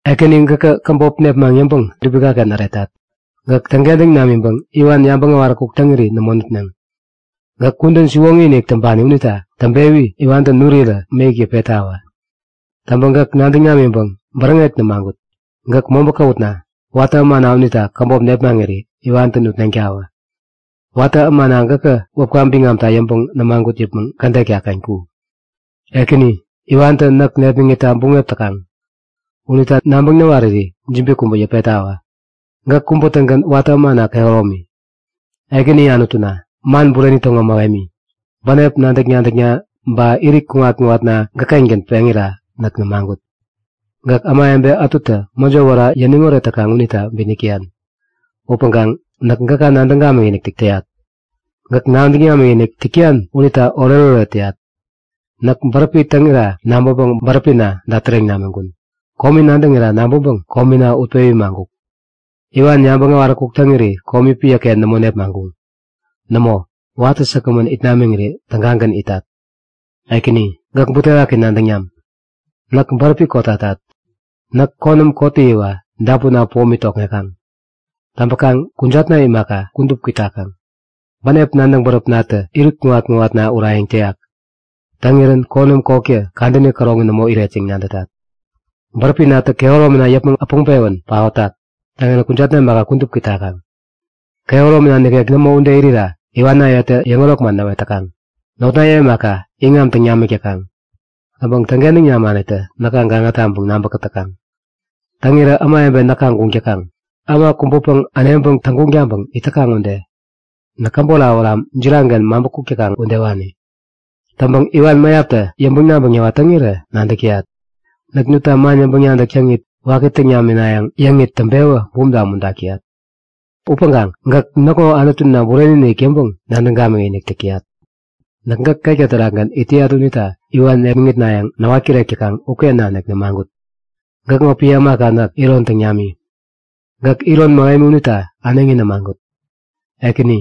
Ekäni gäkä käbop nepmaŋ yäŋpäŋ dubikaken äretat. Gäk täŋkentäŋ namiŋpäŋ iwan yabäŋ äwaräkuk täŋiri nämo nutneŋ. Gäk kudän siwoŋi-inik täŋpani unita täŋpewi iwantä nurirä mäyäk yäpettawä! Täŋpäŋ gäk nadäŋ namiŋpäŋ bäräŋek nämagut. Gäk mobä käwutna, watä ämana unita käbop nepmaŋiri iwantä nutneŋtawä. Watä ämana gäkä wäpka biŋamta yäŋpäŋ nämagut yäpmäŋ kädet tägaken ku! Ekäni, iwantä näk nepmäŋitta buŋep täkaŋ. Unita nabäŋ näwariri jibi kubä yäpettawä! Gäk kubä-tägän watä ämana kehäromi. Ekäni Anutuna, man bureni täŋo mähemi, bänep nadäk-nadäkna ba irit kuŋat-kuŋatna gäk-kengän peŋira näk nämagut. Gäk ämawebe ätutä mäjo wära yäniŋ oret täkaŋ unita bitnäk täyan. Upäŋkaŋ näk gäka nadäŋ gamikinik täyat. Gäk nadäŋ namikinik täk täyan unita oretoret täyat. Näk bäräpi täŋira nabäŋpäŋ bäräpina dätäreŋ namiŋkun. Komi nadäŋira nabäŋpäŋ komina utpewi maŋkuk. Iwan yabäŋ äwaräkuk täŋiri komi piäken nämo nepmaŋkuŋ. Nämo. Watä säkgämän it namiŋiri tägagän itat. Ekäni, gäk butewaki nadäŋ nam. Näk bäräpi kotatat. Näk konäm kottäyiwa dapunna pomi tokŋekaŋ. Täŋpäkaŋ kujatna imaka, kudup kwitakaŋ. Bänep nadäŋ bäräpnatä irit kuŋat-kuŋatna urayäŋ täyak. Täŋirän konäm kotkä kadäni käroŋi nämo iret yäŋ nadätat. Bäräpinatä kehäromina yäpmäŋ äpäŋpewän paotak. Täŋirän kujatna imaka, kudup kwitakaŋ. Kehäromina nikek nämo ude irira iwanayetä yäŋärok man näwet täkaŋ. Notnaye imaka, iŋam täŋ namik täkaŋ. Täŋpäŋ täŋkentäŋ namanitä näka gaŋa taŋpäŋ nabä-kätäkaŋ. Täŋirä ämawebe näka guŋ täkaŋ, äma kubäpäŋ äneŋpäŋ täŋguŋ taŋpäŋ it täkaŋ ude. Näk käbot awäram jiraŋken maŋpä kuk täkaŋ udewani. Täŋpäŋ iwan mäyaptä yäŋpäŋ-nabäŋ näwat täŋirä nadäk täyat. Näk nutta man yäŋpäŋ-nadäk täŋit waki täŋ naminayäŋ yäŋit täŋpewä bumta umuntak täyat. Upäŋkaŋ gäk näkŋo Anutuna bureni-inik yäŋpäŋ-nadäŋ gamikinik täk täyat. Näk gäk ketka terakgän it täyat unita iwan nepmäŋitnayäŋ näwat-kirek täkaŋ uken nanik nämagut. Gäkŋo piä ämaka näk, iron täŋ nami. Gäk iron mähemi unita äneŋi nämagut. Ekäni,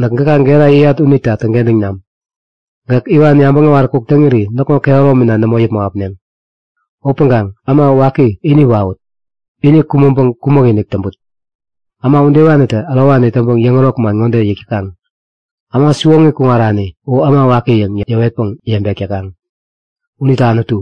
näk gäka gera yäyat unita täŋkentäŋ nam. Gäk iwan yabäŋ äwaräkuk täŋiri näkŋo kehäromina nämo yäpmäŋ äpneŋ. Upäŋkaŋ äma waki ini wawut! Ini kumäŋpäŋ kumäk-inik täŋput! Äma udewanitä ärowani täŋpäŋ yäŋärok man ŋode yäk täkaŋ; Äma siwoŋi kuŋarani u äma waki yäŋ yäwetpäŋ yebek täkaŋ. Unita Anutu,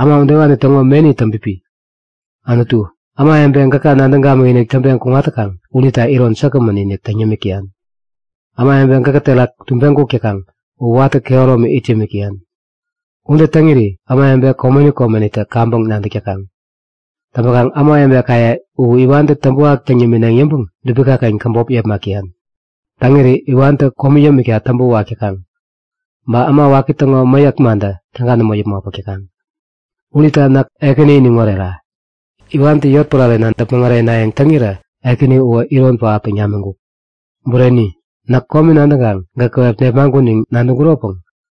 äma udewani täŋo meni täŋpipi. Anutu, ämawebe gäka nadäŋ gamikinik täŋpeŋ kuŋat täkaŋ unita iron säkgämän-inik täŋ yämik täyan. Ämawebe gäkä terak tubeŋ kuk täkaŋ u watä kehäromi it yämik täyan. Ude täŋiri ämawebe komeni komenitä kaŋpäŋ nadäk täkaŋ. Täŋpäkaŋ ämawebekaye u iwantä täŋpäwak täŋ yämineŋ yäŋpäŋ dubikaken käbop yepmak täyan. Täŋiri iwantä komi yämikta täŋpä wak täkaŋ. Ba äma waki täŋo mäyäk mantä täga nämo yäpmäŋ äpäk täkaŋ. Unita näk Ekäni iniŋ orera! Iwantä yotpärarena däpmäŋ eränayäŋ täŋirä Ekäni uwä iron pähap täŋ namiŋkuk. Bureni! Näk komi nadäŋkaŋ gäk käwep nepmaŋkun yäŋ nadäŋkuropäŋ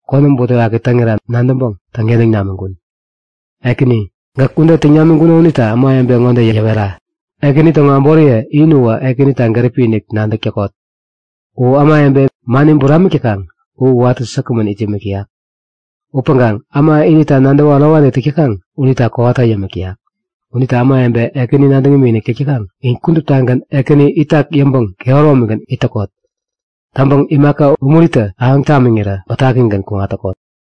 konäm butewaki täŋira nadäŋpäŋ täŋkentäŋ namiŋkun. Ekäni, gäk ude täŋ namiŋkuno unita ämawebe ŋode yäwera; Ekäni täŋo äboriye in uwä Ekänita gäripi-inik nadäk täkot! U ämawebe mani buramik täkaŋ u watä säkgämän it yämik täyak. Upäŋkaŋ äma inita nadäwä ärowani täk täkaŋ unita kowata yämik täyak. Unita ämawebe Ekäni nadäŋ imikinik täk täkaŋ, in kuduptagän Ekäni itak yäŋpäŋ kehäromigän it täkot. Täŋpäŋ imaka umuritä ahäŋ tamiŋirä bätakigän kuŋat täkot!